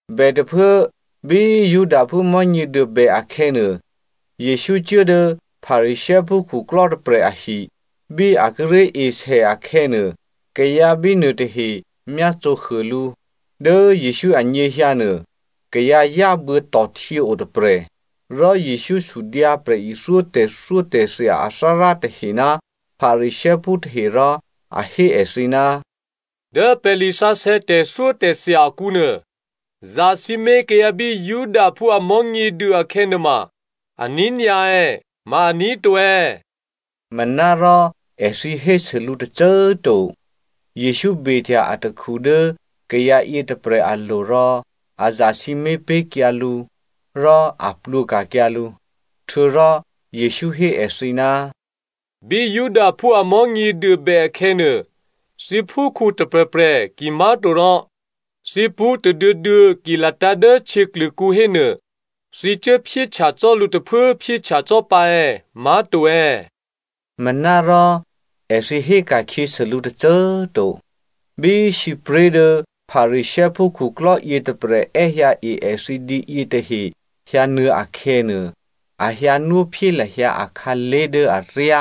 Bètôphuố bí Judaphú Mò̤́nyěduô bè akhè̌nuô, Jesǔ cuố dố Pharisěophú khuklò́ tôprè̤ ahi. Bí a kíré̤ esè akhè̌nuô, kayǎ bínuô tahe myácǒhuô lǔ. Dố Jesǔ anyěhyǎ nuô kayǎ yábuô̌tò̤htyě o tôprè̤. Rò Jesǔ sudyǎ prè̤ithyó tè̤thyótè̤thya athárá tahe ná Pharisěophú tahe rò a hé èthǐ, “Dố pè̤ lisǎsè̌ tè̤thyótè̤thya akǔnuô, zasǐmé̤ kayǎ bí Judaphú a Mò̤́nyěduô akhè̌ nuôma aní̤ nyǎ è̌? Ma aní̤ to è̌?” Manárò èthǐ hésû lǔ tôcô꤮ to. Jesǔ behtya atakhu dố kayǎ yětôprè̤ alo̤ rò a zasǐmé̤ pé̤kyǎ lǔ, rò a plwǒ ka̤kyǎ lǔ. Htuô̌rò Jesǔ hé èthǐ, “Bí Judaphú a Mò̤́nyěduô bè akhè̌nuô, thǐ phúkhǔ tôprè̤prè̤ kimá̤torò thǐ pṳ́ tôduô̌duô̌ ki latǎ̤ dố htyěklûkǔ hénuô, thǐ ki cuốphyéhtya cò́ lǔ tôphuốphyéhtya cò́ pǎ è̌? Ma to è̌?” Manárò èthǐ héka̤khyěsû lǔ tôcô꤮ to. Bí sǐpré̤ dố Pharisěophú khuklò́ yětôprè̤ è́hyǎe èthǐ dǐ yětahe hyǎnuô̌ akhè̌nuô, a hyǎnwóphyé lahyǎ akhǎlé̤ dố aryá.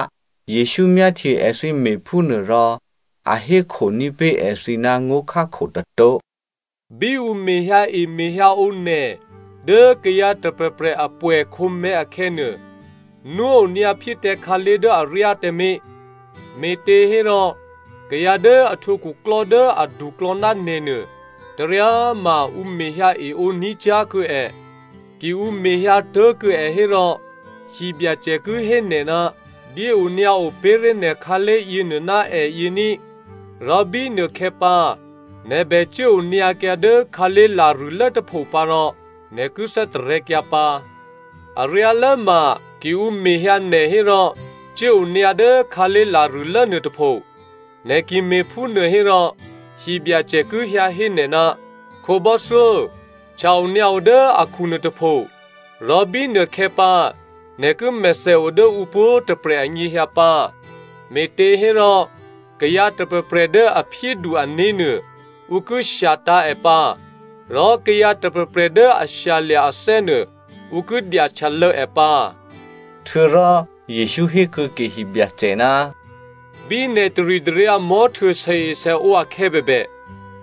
Jesǔ myáhtye èthǐ me̤phúnuôrò a hékhoní̤ pé̤ èthǐ ná ngó̤khákho tôtó̤. “Bí ǔ mehyǎemehyǎǒ nè̤ dố kayǎ tôprè̤prè̤ a pwè̌khǒmè̤̌ akhè̌nuô, nwó onyǎ phyé tǎ khǎlé̤ dố aryá tǎmé̤, me̤těhérò kayǎ dố a htwǒ khuklò́ dố aduklò̌ ná nè̤ nuô, taryá꤮ ma ǔ mehyǎeǒ ní̤ cyá̤ kuô̌ è. Ki ǔ mehyǎ tố̤kuô̌ è hérò hibyacè ki hé nè̤, ‘Dyéonyǎo pé̤ré̤ nè̤ khǎlé̤ yěnuô ná èyě ní,’ rò bínuôkhè̌ pǎ, nè̤ bè cuốonyǎkyǎ dố khǎlé̤ larṳ̂́lố tôpho pǎ rò nè̤ ki thè́tarè̤̌kyǎ pǎ. Aryálốma, ki ǔ mehyǎ nè̤ hérò cuốonyǎ dố khǎlé̤ larṳ̂́lố nuôtôpho. Nè̤ ki me̤phúnuô hérò, hibyacè ki hyǎ hé nè̤, ‘Khǒbò́thyó, htya-onyǎo dố akhu nuôtôpho,’ rò bínuôkhè̌pǎ, nè̤ ki mèthèo dố ǔ pwǒ̤tôprè̤ anyěhyǎ pǎ. Me̤těhérò kayǎ tôprè̤prè̤ dố a phyédu ané̤nuô, ǔ ki shyatǎ̤ è pǎ, rò kayǎ tôprè̤prè̤ dố a shyalya̤ athè́ nuô, ǔ ki dyahtyalô̌ è pǎ.” Htuô̌rò Jesǔ hé kuô̌ke hibyacè, “Bí nè̤ taritaryǎ mò̤́htuô sèesèǒ akhè̌ bèbè,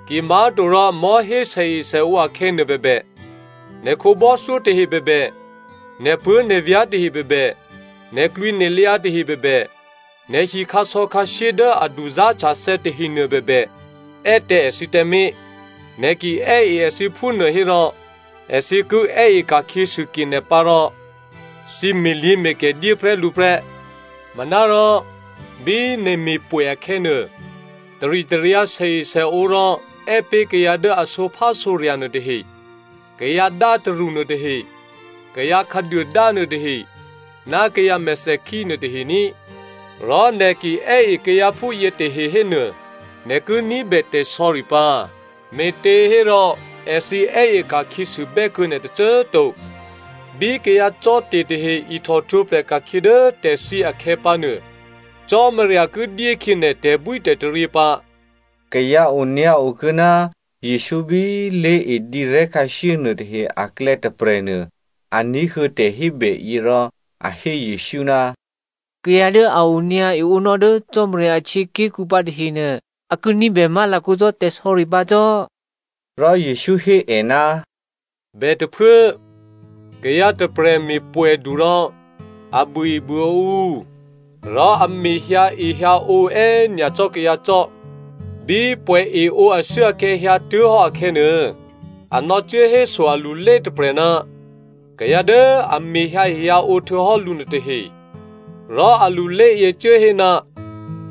kimá̤torò mò̤́hé sèesèǒ akhè̌nuô bèbè, nè̤ khǒbò́thyó tahe bèbè, nè̤puố̤nè̤vyá̤ tahe bèbè, nè̤klwǐnè̤lyǎ tahe bèbè, nè̤hi khǎsò̌khǎshyé dố a duzá̤htyathè̌ tahenuô bèbè, è́ tǎ èthǐ tǎmé̤. Nè̤ ki è́e èthǐ phúnuô hérò èthǐ ki è́e ka̤khyěsû ke nè̤ pǎ rò thǐ me̤lyě̤me̤kè dyé prè́ lǔ prè́. Manárò bí nè̤ me̤pwè̌ akhè̌nuô, taritaryǎ sèesèǒ rò è́ pé̤ kayǎ dố a sǒphásǒrya̤ nuôtahe, kayǎdátarṳ nuôtahe, kayǎ khǎduôdá nuôtahe ná kayǎ mèthèkhí nuôtahe ní꤮. Rò nè̤ ki è́e kayǎ phúyě tahe hénuô, nè̤ ki ní̤bè tè̤sò̌ri pǎ, me̤těhérò èthǐ è́e ka̤khyěsûbè́ kuô̌ nè̤ tôcô꤮ to. Bí kayǎcò́te̤ tahe ihtòhtwǒprè̤ ka̤khyě dố tè̤thyě akhè̌ pǎnuô, Cò́marya ki dyékhyě nè̤ tè̤bwítè̤taryě pǎ.” Kayǎ onyǎo kuô̌ ná Jesǔ bí lé̤e dǐrè̤́khǎshyé nuôtahe aklè̌ tôprè̤nuô, a ní̤huô̌ tè̤hébèyě rò a hé Jesǔ, “Kayǎ dố a onyǎ eǒnò́ dố Cò́marya ahtyěaké̤kǔ pǎ tahenuô, a ki ní̤bè má̤lakǒ cò́ tè̤sò̌ri pǎ cò́!” Rò Jesǔ hé è, “Bètôphuố, kayǎ tôprè̤ me̤pwè̌du rò a buôebuôǒ ǔ, rò a mehyǎehyǎǒ è́nyacò́ kayǎ cò́. Bí pwè̌eǒ ashuốakhè̌ hyǎtuố̤hò́ akhè̌nuô, a nò̌cuốhéso alulé tôprè̤ ná kayǎ dố a mehyǎehyǎǒ htuô̌hò́ lǔ nuôtahe, rò a luléyě cuố hé,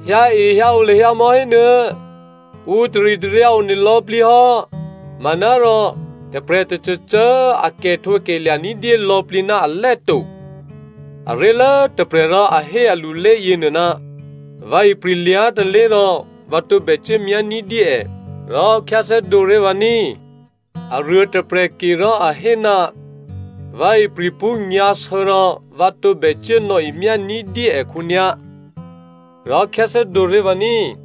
‘Hyǎehyǎǒ lahyǎ mò̌ hénuô̌꤮, ǔ taritaryǎ one lò̌plǐ hò́.’ “Manárò tôprè̤ tôcôcô꤮ a kè̤htǒkè̤lya̤ ní̤dyé lò̌plǐ ná alè́ to. Aré̤lố tôprè̤ rò a hé alulé yěnuô, ‘Vǎ ipri̤ lyá̤ tôlé̤ rò vǎ tǒbè cuốmyá ní̤dyé è. Rò khyáthè́dǒ ré̤ vǎ ní꤮.’ “Aruô tôprè̤ ke rò a hé, ‘Vǎ ipri̤ pṳ́ nyǎ̤sě rò vǎ tǒbè cuố nò̌emyá ní̤dyé è khǒnyá̤. Rò khyáthè́dǒ ré̤ vǎ ní꤮.’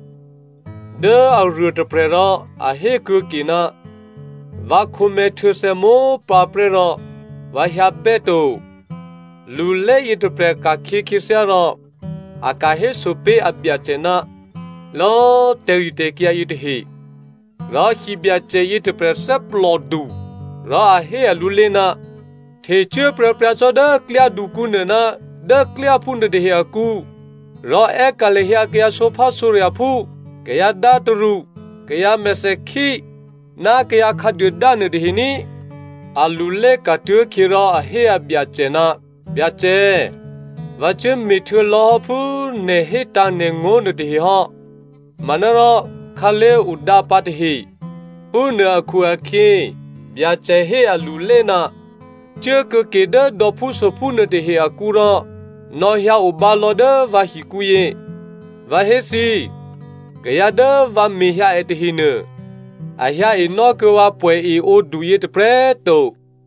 “Dố aruôtôprè̤ rò a hékuô̌ke, ‘Vǎ khǒmè̤̌htuô̌thè̌ mópǎprè́ rò vǎ hyǎbè́ to.’ “Lulé yětôprè̤ ka̤khyě khyěthyá rò a ka̤héso pé̤ abyacè ná lò̌꤮ tè̤ritè̤kyǎ yětahe. Rò hibyacè yětôprè̤ thè́plòdu rò a hé alulé, ‘Htecuố pryǎpryǎ cò́ dố klyádukǔ nuô ná dố klyáphú nuôtahe akǔ, rò è́ka̤ lahyǎ kayǎ sǒphásǒrya̤phú, kayǎdátarṳ, kayǎ mèthèkhí, ná kayǎ khǎduôdá nuôtahe ní꤮.’ “Alulé ka̤tuố̤khyě rò a hé abyacè, ‘Byacè꤮ vǎ cuốme̤htuô̌ lò̌hò́ phú nè̤ hétǎ̤ nè̤ngó̤ nuôtahe hò́, manárò khǎlé̤ odǎpǎ tahe.’ “Phúnuô akhu-akhyě Byacè hé alulé, ‘Cuố kuô̌ke dố dò̌phúsophú nuôtahe akǔ rò nò̌hyǎ obǎ lò̌ dố vǎ hikǔyě. Vǎ hé thǐ, kayǎ dố vǎ mehyǎ è tahenuô, a hyǎ enò́ kuô̌ vǎ pwè̌eǒduyě tôprè̤꤮ to!’”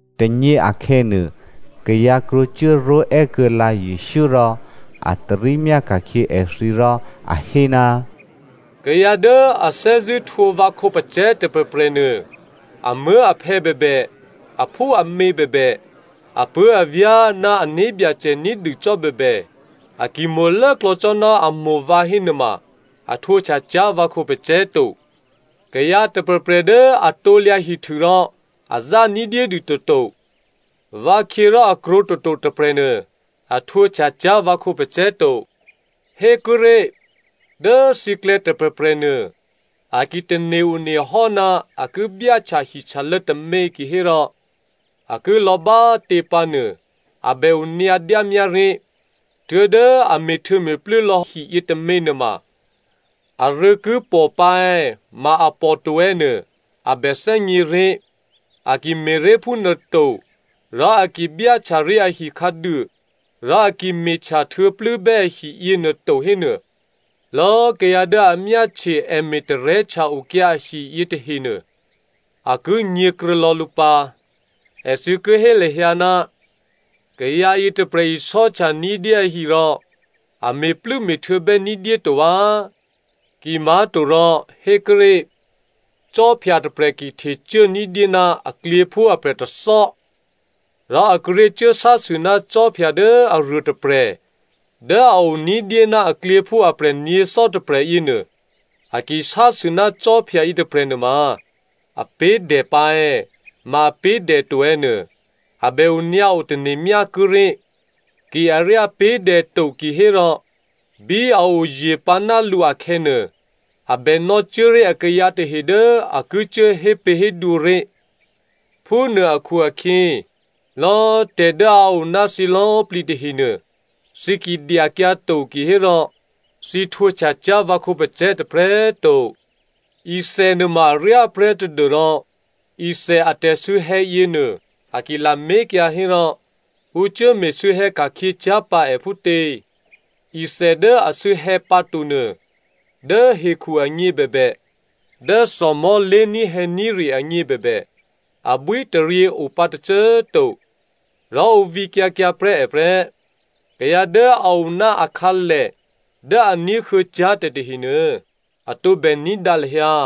Tônyě akhè̌nuô, kayǎ krwǒ cuốró̤è́ kuô̌lǎ Jesǔ rò a tarí myáka̤khyě èthǐ rò a hé, “Kayǎ dố a thè́zṳ̂́ htwǒ vǎ khǒpacè̤̌ tôprè̤prè̤nuô, amuố̤aphè̌ bèbè, aphúamě bèbè, apuố̤avyá̤, ná ané̤byacè ní̤dû cò́ bèbè, a ki mo̤ lốklò̌ cò́ ná a mo̤ vǎ hénuôma a htwǒhtya cyá̤ vǎ khǒpacè̤̌ to. Kayǎ tôprè̤prè̤ dố a krusu rò a zá ní̤dyédû toto, vǎkhyě rò a krwǒ toto tôprè̤nuô, a htwǒhtya cyá̤ vǎ khǒpacè̤̌ to. “Hékuốré̤, dố thǐklè̌ tôprè̤prè̤ nuô, a ki tane̤-onehò́ ná a ki byáhtya hihtyalô̌ tômě kihérò, a ki lò̌ bá꤮ tě pǎ nuô a bè onyǎ dyámyá ré̤. Tuố̤dố a me̤htuô̌me̤plû́ lò̌ hi yětômě nuôma, arû̌ ki pò pǎ è̌ ma a pòto è̌ nuô a bè thè́gně ré̤. A ki me̤ré̤ phúnuôto, rò a ki byáhtyaré̤ ahi khǎduô, rò a ki me̤htya htuô̌plû́bè́ ahi yěnuô to hénuô, lò̌꤮ kayǎ dố a myáhtye è me̤tarè́htya okyǎ ahi yětahenuô, a ki nyě̤kruô̌ lò̌ lǔ pǎ. Èthǐ ki hé lahyǎ, ‘Kayǎ yětôprè̤ isò́htya ní̤dyé ahi rò a me̤plû́me̤htuô̌bè́ ní̤dyé to vǎ.’ “Kimá̤torò, hékuốré̤, khwí tôprè̤ ki htecuố ní̤dyé ná aklyěphú aprè̤ tôthò́, rò a kíré̤ cuốsásû ná khwí dố aruôtôprè̤ dố a o ní̤dyé ná aklyěphú aprè̤ nyě̤thò́ tôprè̤ yěnuô, a ki sásû ná khwí yětôprè̤ nuôma, a pé̤ dè pǎ è̌, ma a pé̤ dè to è̌ nuô, a bè onyǎo tane̤ myá kuốré̤. Ki aryá pé̤ dè to kihérò, bí a oye̤ pǎ ná lǔ akhè̌nuô, a bè nò̌cuố ré̤ akayǎ tahe dố a ki cuố hépě̤hédwǒ ré̤. Phúnuô akhu-akhyě, lò̌꤮ tè̤ dố a o ná thǐ lò̌꤮ plǐ tahenuô, thǐ ki dyakyǎ to kihérò, thǐ htwǒhtya cyá̤ vǎ khǒpacè̤̌ tôprè̤꤮ to. “Ithè nuôma aryá prè́ tadû́rò ithè a tè̤sû̌hè̌ yěnuô a ki lamé̤kyǎ hérò, ǔ cuố me̤sû̌hè̌ ka̤khyě cyá̤ pǎ è phútě? Ithè dố asû̌hè̌ pǎtonuô, dố hekhu agně bèbè, dố thòmò̤́ lé̤ní̤hè̌ní̤re agně bèbè, abwítaryě o pǎ tôcô꤮ to. Rò ǔ vǐkyǎ kyǎ prè́ è prè́.” “Kayǎ dố a o ná akhǎlè dố a ní̤huô̌ cyá̤ tè̤tahenuô a tǒbè ní̤dǎ lahyǎ.”